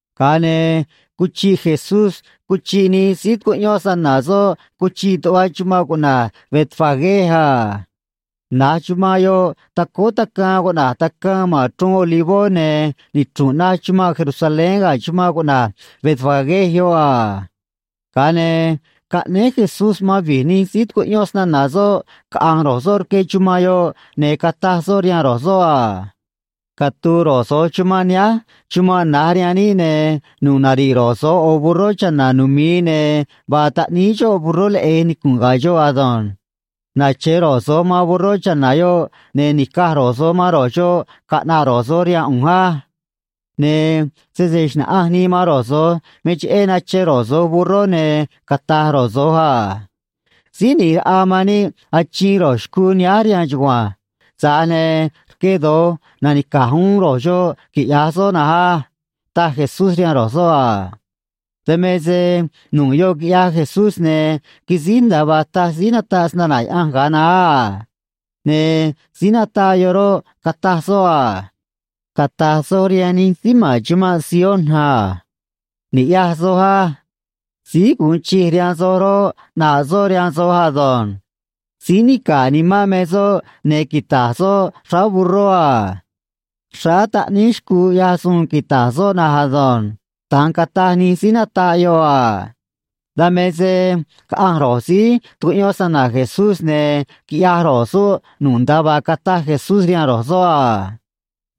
Ga̱a ne̱ cuchiꞌ Jesús cuchiꞌ nij síí tucuꞌyón snana̱ soꞌ cuchiꞌ tuꞌva chumanꞌ cuꞌna̱j Betfagé a. Na̱j chumanꞌ yoꞌ tacóó tacaan cuꞌna̱j Tacaan ma̱n Chruun Olivó, ne̱ nichru̱nꞌ naj chumanꞌ Jerusalén ga̱ chumanꞌ cuꞌna̱j Betfagé yoꞌ a. Ga̱a ne̱ caꞌnéé Jesús man vi̱j nij síí tucuꞌyón snana̱ soꞌ caꞌa̱nj ro̱j soꞌ rque chumanꞌ yoꞌ, ne̱ cataj soꞌ rihaan ro̱j soꞌ a: ―Catu̱u̱ ro̱j so̱j chumanꞌ nihánj, chumanꞌ na̱j rihaan níꞌ, ne̱ nu̱ꞌ nari̱ꞌ ro̱j so̱j ꞌo̱ burró cha̱na̱ numi̱i, ne̱ vaa taꞌníí xoꞌ burró leꞌe̱j nicu̱nꞌ ga̱ xoꞌ ado̱nj. Nache̱ ro̱j so̱j man burró cha̱na̱ yoꞌ, ne̱ ni̱caj ro̱j so̱j man ro̱j xoꞌ caꞌna̱ꞌ ro̱j so̱j rihaan ꞌu̱nj á. Ne̱ sese xna̱ꞌanj nii man ro̱j so̱j me cheꞌé nache ro̱j so̱j burró, ne̱ cata̱j ro̱j so̱j a: “Síí ꞌNi̱j Raꞌa man níꞌ achiin ro̱j xcuu nihánj rihaan chugua̱nj. Tza̱j ne̱ rque do̱j nanica̱j uún ro̱j xoꞌ, quiꞌya̱j soꞌ na̱nj á” ―taj Jesús rihaan ro̱j so̱ꞌ a. Dan me se nu̱ꞌ yoꞌ quiꞌyaj Jesús, ne̱ quisíj nda̱a vaa taj síí nataꞌ snana̱ Yaꞌanj ga̱a naá a. Ne̱ síí nataꞌ yoꞌ roꞌ, cataj soꞌ a: Cata̱j soj rihaan nij síí ma̱n chumanꞌ Sion a: “Ni̱ꞌyaj soj á. Síí gu̱un chij rihaan soj roꞌ, ꞌnaꞌ soꞌ rihaan soj ado̱nj. Síí nica̱ꞌ nimán me soꞌ, ne̱ quita̱j soꞌ xráá burró a. Xráá taꞌníí xcuu ꞌyaj suun quita̱j soꞌ na̱nj ado̱nj.” Da̱nj cataj nij síí nataꞌ yoꞌ a. Dan me se caꞌanj ro̱j síí tucuꞌyón snana̱ Jesús, ne̱ quiꞌyaj ro̱j soꞌ nu̱ꞌ nda̱a vaa cataj Jesús rihaan ro̱j soꞌ a.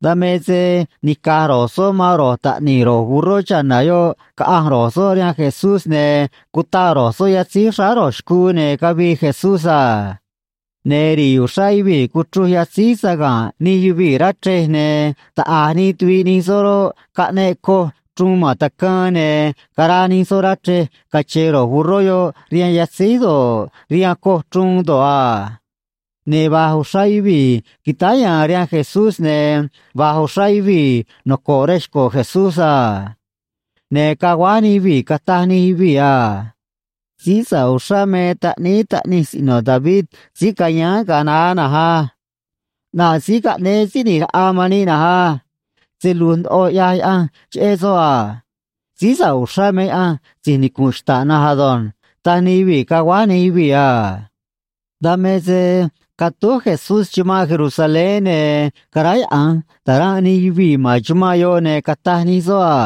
Dan me se nica̱j ro̱j soꞌ man ro̱j taꞌni̱j ro̱j burró cha̱na̱ yoꞌ caꞌanj ro̱j soꞌ rihaan Jesús, ne̱ cutaꞌ ro̱j soꞌ yatzíj xráá ro̱j xcuu, ne̱ cavii Jesús a. Ne̱ ri̱i̱ uxrá yuvii̱ cuchruj yatzíj saga̱nꞌ nij yuvii̱ rá chrej, ne̱ taꞌa̱j nij tuviꞌ nij soꞌ roꞌ, caꞌneꞌ coj chruun ma̱n tacaan, ne̱ caraa nij soꞌ rá chrej, cache̱e̱ ro̱j burró yoꞌ rihaan yatzíj do̱ꞌ, rihaan coj chruun do̱ꞌ a. Ne̱ va̱j uxrá yuvii̱ quitáá ya̱a̱n rihaan Jesús, ne̱ va̱j uxrá yuvii̱ noco̱ꞌ rej xco̱ Jesús a. Ne̱ caguáj nij yuvii̱, cataj nij yuvii̱ a: ―Síí sa̱ꞌ uxrá me Taꞌníí Taꞌnij Siꞌno̱ David síí cayáán ga̱a naá na̱nj á. ꞌNaꞌ síí caꞌnéé Síí ꞌNi̱j Raꞌa man níꞌ na̱nj á. Se lu̱j ndoꞌo ꞌyaj Yaꞌanj cheꞌé soꞌ a. Síí sa̱ꞌ uxrá me Yaꞌanj si̱j nicu̱nꞌ xta̱ꞌ na̱nj ado̱nj ―taj nij yuvii̱, caguáj nij yuvii̱ a. Dan me se catúj Jesús chumanꞌ Jerusalén, ne̱ caráyaꞌa̱nj ta̱ranꞌ nij yuvii̱ ma̱n chumanꞌ yoꞌ, ne̱ cataj nij soꞌ a: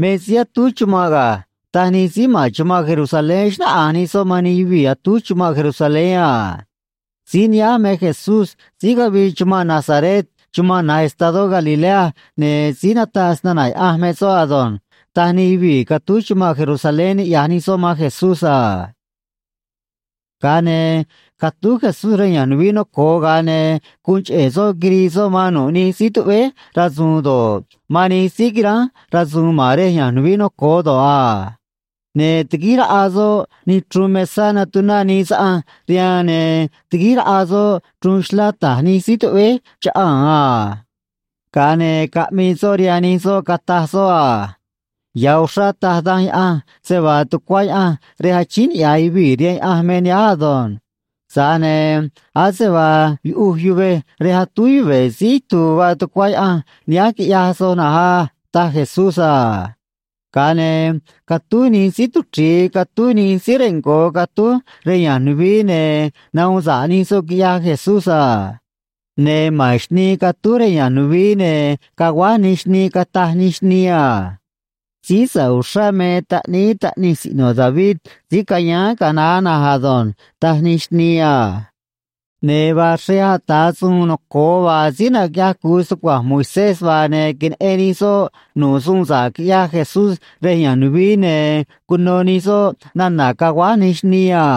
―Me síí atúj chumanꞌ ga̱ ―taj nij síí ma̱n chumanꞌ Jerusalén, xnáꞌanj nij soꞌ man nij yuvii̱ atúj chumanꞌ Jerusalén a. ―Síí nihánj me Jesús síí cavii chumanꞌ Nazaret chumanꞌ na̱j estadó Galilea, ne̱ síí nataꞌ snana̱ Yaꞌanj me soꞌ ado̱nj ―taj nij yuvii̱ catúj chumanꞌ Jerusalén, niꞌya̱j nij soꞌ man Jesús a. Ga̱a ne̱ catúj Jesús rej ya̱nj nuvií noco̱o, ga̱a ne̱ guun cheꞌe̱ soꞌ quirii soꞌ man nu̱ꞌ nij síí tuꞌvéj rasu̱u̱n do̱ꞌ, man nij síí quiránj rasu̱u̱n ma̱n rej ya̱nj nuvií noco̱o do̱ꞌ a. Ne̱ tiguíj raꞌa soꞌ nij chruun mesá natuná nii saꞌanj rihaan, ne̱ tiguíj raꞌa soꞌ chruun xlá ta̱j nij síí tuꞌvéj chaꞌaa̱n a. Ga̱a ne̱ caꞌmii soꞌ rihaan nij soꞌ, cataj soꞌ a: ―Ya̱ uxrá taj Danj Yaꞌanj se vaa tucuá Yaꞌanj rej achíín niꞌya̱j yuvii̱ rihaan Yaꞌanj me nihánj ado̱nj. Tza̱j ne̱ ase vaa yuꞌuj yuvej rej atúj yuve̱ síí itu̱u̱ vaa tucuá Yaꞌanj nihánj, quiꞌyaj soj na̱nj á ―taj Jesús a. Ga̱a ne̱ catúj nij síí tuchri̱i catúj nij síí rengo̱ catúj rej ya̱nj nuvií, ne̱ nahuun sa̱ꞌ nij soꞌ, quiꞌyaj Jesús a. Ne̱ ma̱n xnii catúj rej ya̱nj nuvií, ne̱ caguáj nij xnii cataj nij xnii a: ―Síí sa̱ꞌ uxrá me Taꞌníí Taꞌnij Siꞌno̱ David síí cayáán ga̱a naá na̱nj ado̱nj ―taj nij xnii a. Ne̱ vaa xrej ata̱ suun noco̱o vaa síí naquiꞌyaj cu̱u stucua̱nj Moisés vaa, ne̱ queneꞌen nij soꞌ nu̱ꞌ suun sa̱ꞌ quiꞌyaj Jesús rej ya̱nj nuvií, ne̱ cuno nij soꞌ nana̱ caguáj nij xnii a.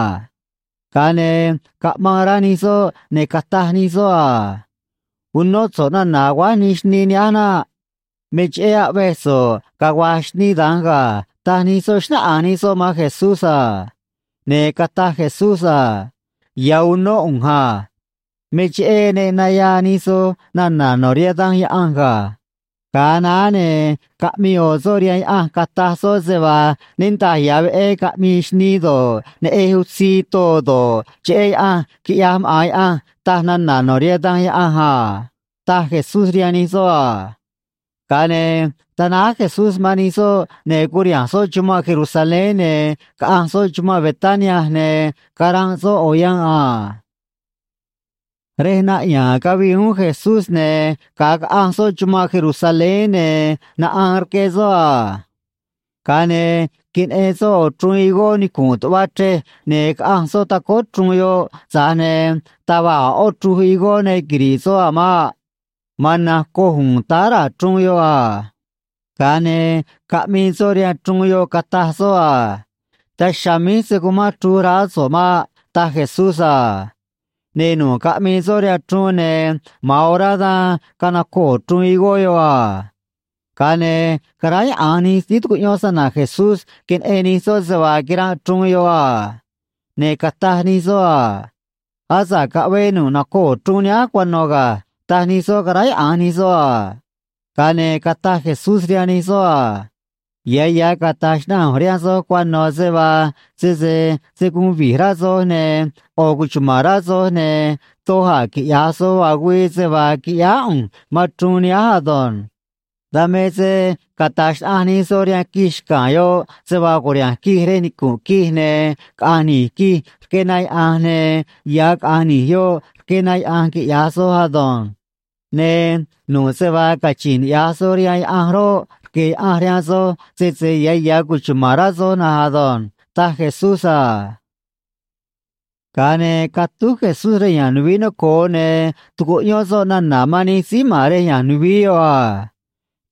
Ga̱a ne̱ caꞌmaan rá nij soꞌ, ne̱ cataj nij soꞌ a: ―Unó so̱ꞌ nana̱ aguáj nij xnii nihánj naꞌ. Me cheꞌé aꞌvej so̱ꞌ cagua̱j xnii da̱nj ga̱ ―taj nij soꞌ, xnáꞌanj nij soꞌ man Jesús a. Ne̱ cataj Jesús a: ―Ya̱ unó ꞌu̱nj a. Me cheꞌé ne naya̱a̱ nij soj nana̱ no̱ rihaan Danj Yaꞌanj ga̱. Ga̱a naá, ne̱ caꞌmii ꞌo̱ soꞌ rihaan Yaꞌanj, cataj soꞌ se vaa niꞌndaj ya̱ veꞌé caꞌmii xnii do̱ꞌ, neꞌej utzii too do̱ꞌ, cheꞌé Yaꞌanj, quiꞌyaj maꞌa̱n Yaꞌanj, taj nana̱ no̱ rihaan Danj Yaꞌanj a ―taj Jesús rihaan nij soꞌ a. Ga̱a ne̱ tanáj Jesús man nij soꞌ, ne̱ curiha̱nj soꞌ chumanꞌ Jerusalén, ne̱ caꞌanj soꞌ chumanꞌ Betania, ne̱ caranꞌ soꞌ ꞌo̱ yanꞌ a. Rej naꞌya̱a̱n cavii uún Jesús, ne̱ ga̱a caꞌanj soꞌ chumanꞌ Jerusalén, ne̱ naꞌaan rque soꞌ a. Ga̱a ne̱ queneꞌen soꞌ ꞌo̱ chruun higó nicu̱nꞌ tuꞌva chrej, ne̱ caꞌanj soꞌ tacóó chruun yoꞌ, tza̱j ne̱ taj va̱j a̱ ꞌó chruj higó ne quiri̱ꞌ soꞌ a̱ maꞌ. Ma̱an na̱nj coj u̱u̱n táá raa̱ chruun yoꞌ a. Ga̱a ne̱ caꞌmii soꞌ rihaan chruun yoꞌ, cataj soꞌ a: ―Daj chiha̱a̱ míj se̱ cumán chruj raá so̱ꞌ maꞌ ―taj Jesús a. Ne̱ nu̱ꞌ caꞌmii soꞌ rihaan chruun, ne̱ ma̱an orá dan canacoo̱ chruun higó yoꞌ a. Ga̱a ne̱ caráyaꞌa̱nj nij síí tucuꞌyón snana̱ Jesús, queneꞌen nij soꞌ se vaa quiranꞌ chruun yoꞌ a. Ne̱ cataj nij soꞌ a: ―Asa̱ꞌ caꞌvee nu̱ꞌ nacoo̱ chruun nihánj cuano̱ ga̱ ―taj nij soꞌ, caráyaꞌa̱nj nij soꞌ a. Ga̱a ne̱ cataj Jesús rihaan nij soꞌ a: ―Ya̱ ya̱ cata̱j xnaꞌanj ꞌu̱nj rihaan soj cuano̱ se vaa sese se̱ guun vi̱j rá soj ne̱ ꞌo̱ cuchuma̱n rá soj, ne̱ doj a̱ quiꞌya̱j soj vaa güii, se vaa quiꞌyáá ꞌu̱nj man chruun nihánj ado̱nj. Dan me se cata̱j xnaꞌanj nij soj rihaan quij xca̱a̱n yoꞌ se vaa cu̱riha̱nj quij rej nicu̱nꞌ quij ne̱ caꞌa̱nj ni̱j quij rque na yaꞌa̱nj, ne̱ ya̱ caꞌa̱nj ni̱j yoꞌ rque na yaꞌa̱nj, quiꞌya̱j soj ado̱nj. Ne̱ nu̱ꞌ se vaa cachi̱nj niꞌya̱j soj rihaan Yaꞌanj roꞌ, rque̱ Yaꞌanj rihaan soj, sese ya̱ ya̱ cuchuma̱n rá soj na̱nj ado̱nj ―taj Jesús a. Ga̱a ne̱ catúj Jesús rej ya̱nj nuvií noco̱o, ne̱ tucuꞌyón soꞌ nana̱ man nij síí ma̱n rej ya̱nj nuvií yoꞌ a.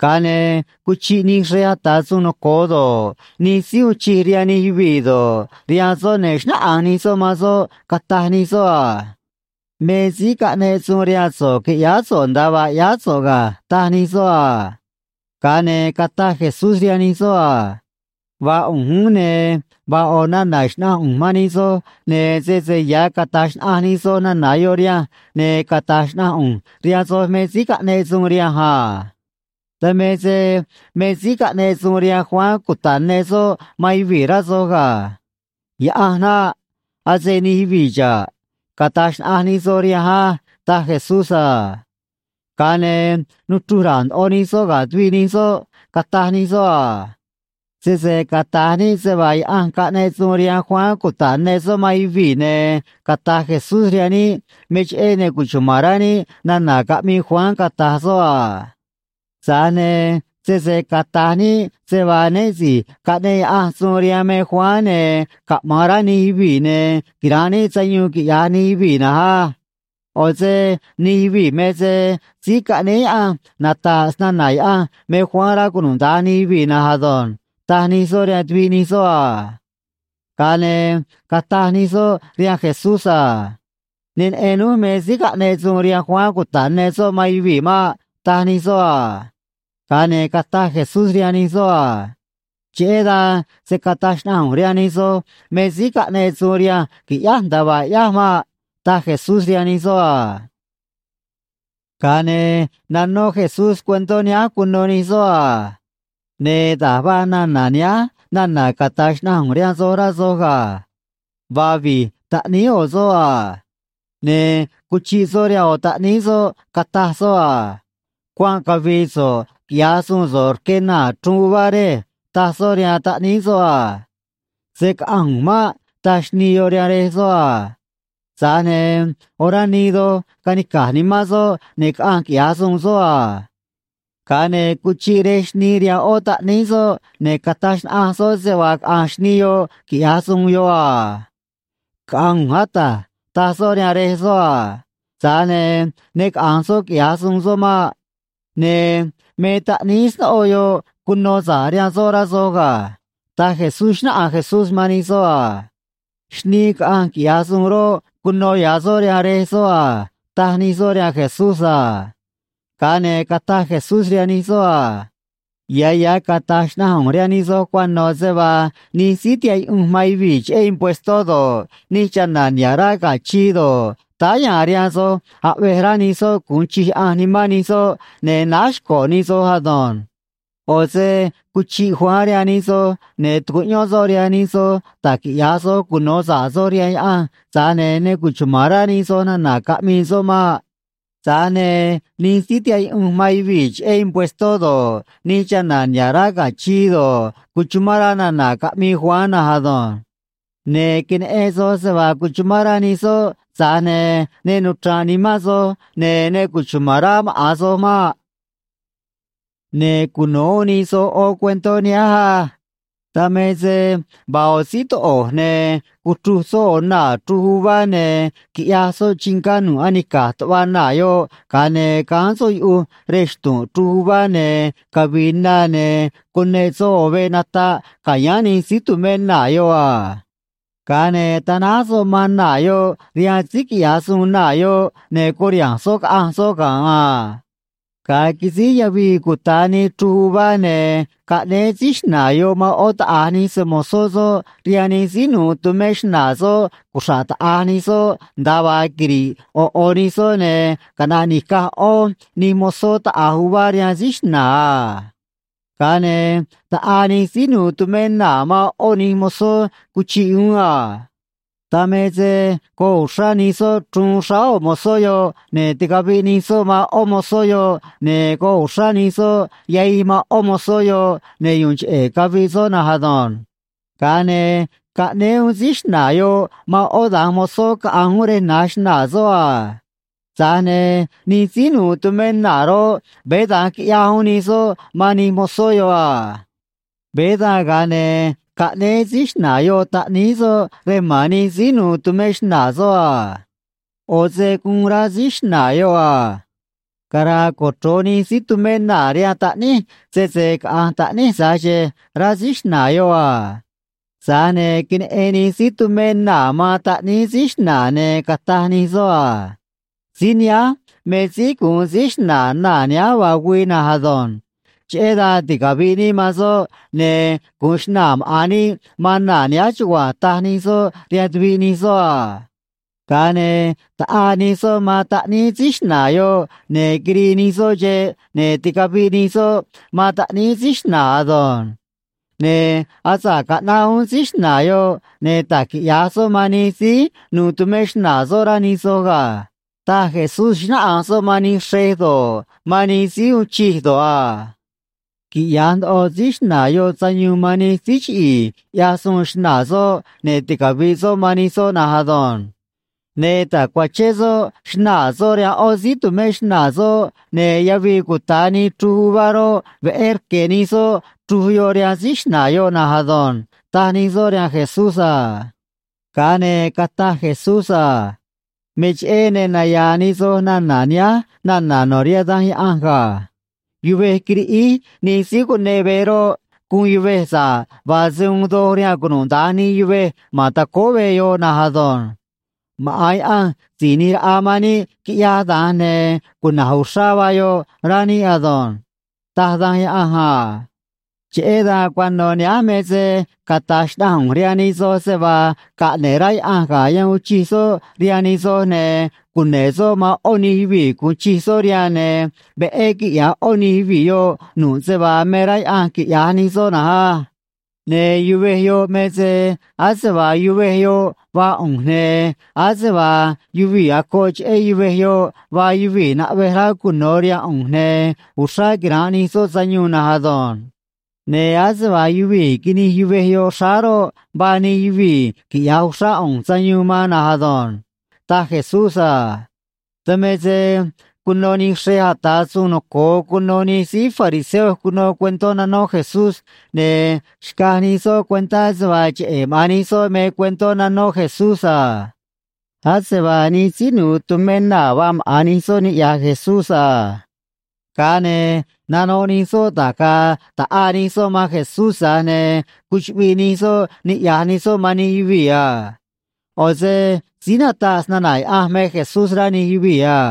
Ga̱a ne̱ cuchiꞌ nij xrej ata̱ suun noco̱o do̱ꞌ, nij síí uun chij rihaan nij yuvii̱ do̱ꞌ, rihaan soꞌ, ne̱ xnáꞌanj nij soꞌ man soꞌ, cataj nij soꞌ a: ―Me síí caꞌneꞌ suun rihaan so̱ꞌ qui̱ꞌyáá so̱ꞌ nda̱a vaa ꞌyáá so̱ꞌ ga̱ ―taj nij soꞌ a. Ga̱a ne̱ cataj Jesús rihaan nij soꞌ a: ―Vaa ꞌu̱nj uún, ne̱ vaa ꞌo̱ nana̱ xna̱ꞌanj ꞌu̱nj man nij soj, ne̱ sese ya̱ cata̱j xnaꞌanj nij soj nana̱ yoꞌ rihanj, ne̱ cata̱j xnaꞌanj ꞌu̱nj rihaan soj me síí caꞌneꞌ suun rihanj a. Dan me se me síí caꞌneꞌ suun rihaan Juan cuta̱ꞌ ne soꞌ man yuvii̱, rá soj ga̱. Yaꞌanj naꞌ. Ase nij yuvii̱ xa̱ꞌ. Cata̱j xnaꞌanj nij soj rihanj á ―taj Jesús a. Ga̱a ne̱ nuchruj ra̱a̱ ndoꞌo nij soꞌ ga̱ tuviꞌ nij soꞌ, cataj nij soꞌ a: ―Sese cata̱j níꞌ se vaa Yaꞌanj caꞌneꞌ suun rihaan Juan cuta̱ꞌ ne soꞌ man yuvii̱, ne̱ cata̱j Jesús rihaan níꞌ me cheꞌé ne cuchuma̱n rá níꞌ nana̱ caꞌmii Juan, cata̱j soꞌ a. Tza̱j ne̱ sese cata̱j níꞌ se vaa né si̱j caꞌneꞌ Yaꞌanj suun rihaan me Juan, ne̱ caꞌma̱an rá nij yuvii̱, ne̱ quira̱nꞌ níꞌ sayuun, quiꞌya̱j nij yuvii̱ na̱nj á. ꞌO̱ se nij yuvii̱ me se síí caꞌnéé Yaꞌanj nata̱ꞌ snana̱ Yaꞌanj me Juan, rá cunuda̱nj nij yuvii̱ na̱nj ado̱nj ―taj nij soꞌ rihaan tuviꞌ nij soꞌ a. Ga̱a ne̱ cataj nij soꞌ rihaan Jesús a: ―Ne neꞌen núj me síí caꞌneꞌ suun rihaan Juan cuta̱ꞌ ne soꞌ man yuvii̱ maꞌ ―taj nij soꞌ a. Ga̱a ne̱ cataj Jesús rihaan nij soꞌ a: ―Cheꞌé dan se̱ cataj xnaꞌanj ꞌu̱nj rihaan nij soj me síí caꞌneꞌ suun rihanj qui̱ꞌyáj nda̱a vaa ꞌyáj maꞌ ―taj Jesús rihaan nij soꞌ a. Ga̱a ne̱ nanó Jesús cuentó nihánj cuno nij soꞌ a: ―Ne̱ da̱j vaa nana̱ nihánj nana̱ cata̱j xnaꞌanj ꞌu̱nj rihaan soj, rá soj ga̱. Vaa vi̱j taꞌníí ꞌo̱ soꞌ a. Ne̱ cuchiꞌ soꞌ rihaan ꞌo̱ taꞌníí soꞌ, cataj soꞌ a: “Cuanꞌ cavi̱i̱ so̱ꞌ quiꞌya̱j suun so̱ꞌ rque naa̱ chruj uvá, rej”, taj soꞌ rihaan taꞌníí soꞌ a. “Se̱ caꞌanj ꞌu̱nj maꞌ”, taj xnii yoꞌ rihaan rej soꞌ a. Tza̱j ne̱ orá nii doj canica̱j nimán soꞌ, ne̱ caꞌanj quiꞌya̱j suun soꞌ a. Ga̱a ne̱ cuchiꞌ rej xnii rihaan ꞌó taꞌníí soꞌ, ne̱ cataj xnaꞌanj soꞌ se vaa caꞌa̱nj xnii yoꞌ, quiꞌya̱j suun yoꞌ a. “Caꞌa̱nj ꞌu̱nj, ata̱j”, taj soꞌ rihaan rej soꞌ a. Tza̱j ne̱ ne caꞌa̱nj soꞌ quiꞌya̱j suun soꞌ maꞌ. Ne̱ me taꞌníí snóꞌo yoꞌ cuno sa̱ꞌ rihaan soꞌ, rá soj ga̱ ―taj Jesús, xnáꞌanj Jesús man nij soꞌ a. ―Xnii caꞌanj quiꞌya̱j suun roꞌ, cuno ya̱ soꞌ rihaan rej soꞌ a ―taj nij soꞌ rihaan Jesús a. Ga̱a ne̱ cataj Jesús rihaan nij soꞌ a: ―Ya̱ ya̱ cata̱j xnaꞌanj ꞌu̱nj rihaan nij soj cuano̱ se vaa nij síí tihaꞌ yuꞌunj man yuvii̱ cheꞌé impuestó do̱ꞌ, nij chana̱ niha̱ꞌ rá ga̱ chii do̱ꞌ, táá ya̱a̱n rihaan soj aꞌvej rá nij soꞌ gu̱un chij Yaꞌanj nimán nij soꞌ, ne̱ náj xco̱ nij soj ado̱nj. ꞌO̱ se cuchiꞌ Juan rihaan nij soj, ne̱ tucuꞌyón soꞌ rihaan nij soj da̱j quiꞌya̱j soj cuno̱ sa̱ꞌ soj rihaan Yaꞌanj, tza̱j ne̱ ne cuchuma̱n rá nij soj nana̱ caꞌmii soꞌ maꞌ. Tza̱j ne̱ nij síí tihaꞌ yuꞌunj man yuvii̱ cheꞌé impuestó do̱ꞌ, nij chana̱ niha̱ꞌ rá ga̱ chii do̱ꞌ, cuchumán rá nana̱ caꞌmii Juan na̱nj ado̱nj. Ne̱ queneꞌen soj se vaa cuchumán rá nij soꞌ, tza̱j ne̱ ne nuchra̱nꞌ nimán soj, ne̱ ne cuchuma̱n rá maꞌa̱n soj maꞌ. ’Ne̱ cuno̱ uún nij soj ꞌó cuentó nihánj á: Dan me se vaa ꞌo̱ síí toꞌo̱j, ne̱ cuchruj soꞌ ꞌo̱ naa̱ chruj uvá, ne̱ quiꞌyaj soꞌ chingá nu̱ꞌ anica̱j tuꞌva naa̱ yoꞌ, ga̱a ne̱ gáán soꞌ yuꞌuj rej xtu̱nꞌ chruj uvá ne̱ cavi̱i̱ na, ne̱ cuneꞌ soꞌ ꞌo̱ veꞌ nataꞌ ca̱yáán nij síí tu̱mé naa̱ yoꞌ a. Ga̱a ne̱ tanáj soꞌ man naa̱ yoꞌ rihaan síí quiꞌya̱j suun naa̱ yoꞌ, ne̱ curiha̱nj soꞌ caꞌanj soꞌ ga̱nꞌ a. ’Ga̱a quisíj yavii cuta̱ nii chruj uvá, ne̱ caꞌnéé síí xna̱a̱ yoꞌ man ꞌó taꞌa̱j nij se‑mo̱zó soꞌ rihaan nij síí nu̱u̱ tumé xnaa̱ soꞌ cuxra̱ꞌ taꞌa̱j nij soꞌ nda̱a vaa quiri̱ꞌ ꞌo̱ ꞌo̱ nij soꞌ, ne̱ caꞌna̱ꞌ ni̱caj ꞌó nij mozó taꞌa̱j uvá rihaan síí xna̱a̱ a. Ga̱a ne̱ taꞌaa nij síí nu̱u̱ tumé naa̱ man ꞌó nij mozó cuchiꞌ uún a. Dan me se goꞌ uxrá nij soꞌ chruun xráá ꞌo̱ mozó yoꞌ, ne̱ ticaviꞌ nij soꞌ man ꞌó mozó yoꞌ, ne̱ goꞌ uxrá nij soꞌ yahij man ꞌó mozó yoꞌ ne̱ yu̱u̱n cheꞌe̱ caviꞌ soꞌ na̱nj ado̱nj. Ga̱a ne̱ caꞌnéé uún síí xna̱a̱ yoꞌ man ꞌó da̱nj mozó caꞌa̱nj uún rej na̱j xnaa̱ soꞌ a. Tza̱j ne̱ nij síí nu̱u̱ tumé naa̱ roꞌ, veé da̱nj quiꞌyaj uún nij soꞌ man nij mozó yoꞌ a. ’Veé dan, ga̱a ne̱ caꞌnéé síí xna̱a̱ yoꞌ taꞌníí soꞌ rej ma̱n nij síí nu̱u̱ tumé xnaa̱ soꞌ a. ꞌO̱ se guun rá síí xna̱a̱ yoꞌ a: “Cara̱a̱ cochro̱j nij síí tumé naa̱ rihaan taꞌníj sese caꞌa̱nj taꞌníj tza̱j xe̱e̱”, rá síí xna̱a̱ yoꞌ a. Tza̱j ne̱ queneꞌen nij síí tumé naa̱ man taꞌníí síí xna̱a̱, ne̱ cataj nij soꞌ a: “Síí nihánj me síí gu̱un síí xna̱a̱ naa̱ nihánj vaa güii na̱nj ado̱nj. Cheꞌé dan ticavi̱ꞌ níꞌ man soꞌ, ne̱ gu̱un xna̱a̱ maꞌa̱n níꞌ man naa̱ nihánj chugua̱nj”, taj nij soꞌ rihaan tuviꞌ nij soꞌ a. Ga̱a ne̱ taꞌaa nij soꞌ man taꞌníí síí xna̱a̱ yoꞌ, ne̱ quirii nij soꞌ xeꞌ, ne̱ ticaviꞌ nij soꞌ man taꞌníí síí xna̱a̱ ado̱nj. Ne̱ asa̱ꞌ caꞌnaꞌ uún síí xna̱a̱ yoꞌ, ne̱ da̱j quiꞌya̱j soꞌ man nij síí nu̱u̱ tumé xnaa̱ soꞌ, rá nij soj ga̱ ―taj Jesús, xnáꞌanj soꞌ man nij xrej do̱ꞌ, man nij síí uun chij do̱ꞌ a. ―Quiꞌya̱j ndoꞌo síí xna̱a̱ yoꞌ sayuun man nij síí chiꞌi̱i̱ ꞌyaj suun xnaa̱ soꞌ, ne̱ ticavi̱ꞌ soꞌ man nij soꞌ na̱nj ado̱nj. Ne̱ ta̱cuachén soꞌ xnaa̱ soꞌ rihaan ꞌó síí tu̱mé xnaa̱ soꞌ, ne̱ yavii cuta̱ nii chruj uvá roꞌ, veꞌé rque̱ nij soꞌ chruj yoꞌ rihaan síí xna̱a̱ yoꞌ na̱nj ado̱nj ―taj nij soꞌ rihaan Jesús a. Ga̱a ne̱ cataj Jesús a: ―Me cheꞌé ne naya̱a̱ nij soj nana̱ nihánj nana̱ no̱ rihaan Danj Yaꞌanj ga̱: Yuvej quiriꞌíj nij síí cuneꞌ veꞌ roꞌ, guun yuvej sa̱ꞌ vaa se uun doj rihaan cunuda̱nj nij yuvej ma̱n tacóó veꞌ yoꞌ na̱nj ado̱nj. Maꞌa̱n Yaꞌanj Si̱j ꞌNi̱j Raꞌa man níꞌ quiꞌyaj da̱nj, ne̱ cuna̱j uxrá vaa yoꞌ, rá níꞌ ado̱nj, taj Danj Yaꞌanj a. Cheꞌé dan cuano̱ nihánj me se cata̱j xnaꞌanj ꞌu̱nj rihaan nij soj se vaa caꞌne̱ꞌ rá Yaꞌanj ga̱ yan uun chij soꞌ rihaan nij soj, ne̱ cune̱ꞌ soꞌ man ꞌó nij yuvii̱ gu̱un chij soꞌ rihaan, ne̱ veꞌé quiꞌya̱j ꞌó nij yuvii̱ yoꞌ nu̱ꞌ se vaa me rá Yaꞌanj quiꞌya̱j nij soꞌ na̱nj á. Ne̱ yuvej yoꞌ me se ase vaa yuvej yoꞌ vaa ꞌu̱nj, ne̱ ase vaa yuvii̱ acoꞌ cheꞌé yuvej yoꞌ vaa yuvii̱ naꞌvej rá cuno̱ rihaan ꞌu̱nj, ne̱ uxrá quira̱nꞌ nij soꞌ sayuun na̱nj ado̱nj. Ne̱ ase vaa yuvii̱ quinij yuvej yoꞌ xráá roꞌ, vaa nij yuvii̱ quiꞌya̱j uxrá ꞌu̱nj sayuun man na̱nj ado̱nj ―taj Jesús a. Dan me se cuno nij xrej ata̱ suun noco̱o cuno nij síí fariseo cuno cuentó nanó Jesús, ne̱ xcaj nij soꞌ cuentá se vaa cheꞌe̱ maꞌa̱n nij soꞌ me cuentó nanó Jesús a. Ase vaa nij síí nu̱u̱ tumé naa̱ vaa maꞌa̱n nij soꞌ niꞌya̱j Jesús a. Ga̱a ne̱ nanoꞌ nij soꞌ da̱j ga̱a̱ ta̱ꞌaa nij soꞌ man Jesús, tza̱j ne̱ cuchuꞌviꞌ nij soꞌ niꞌya̱j nij soꞌ man nij yuvii̱ a. ꞌO̱ se síí nataꞌ snana̱ Yaꞌanj me Jesús, rá nij yuvii̱ a.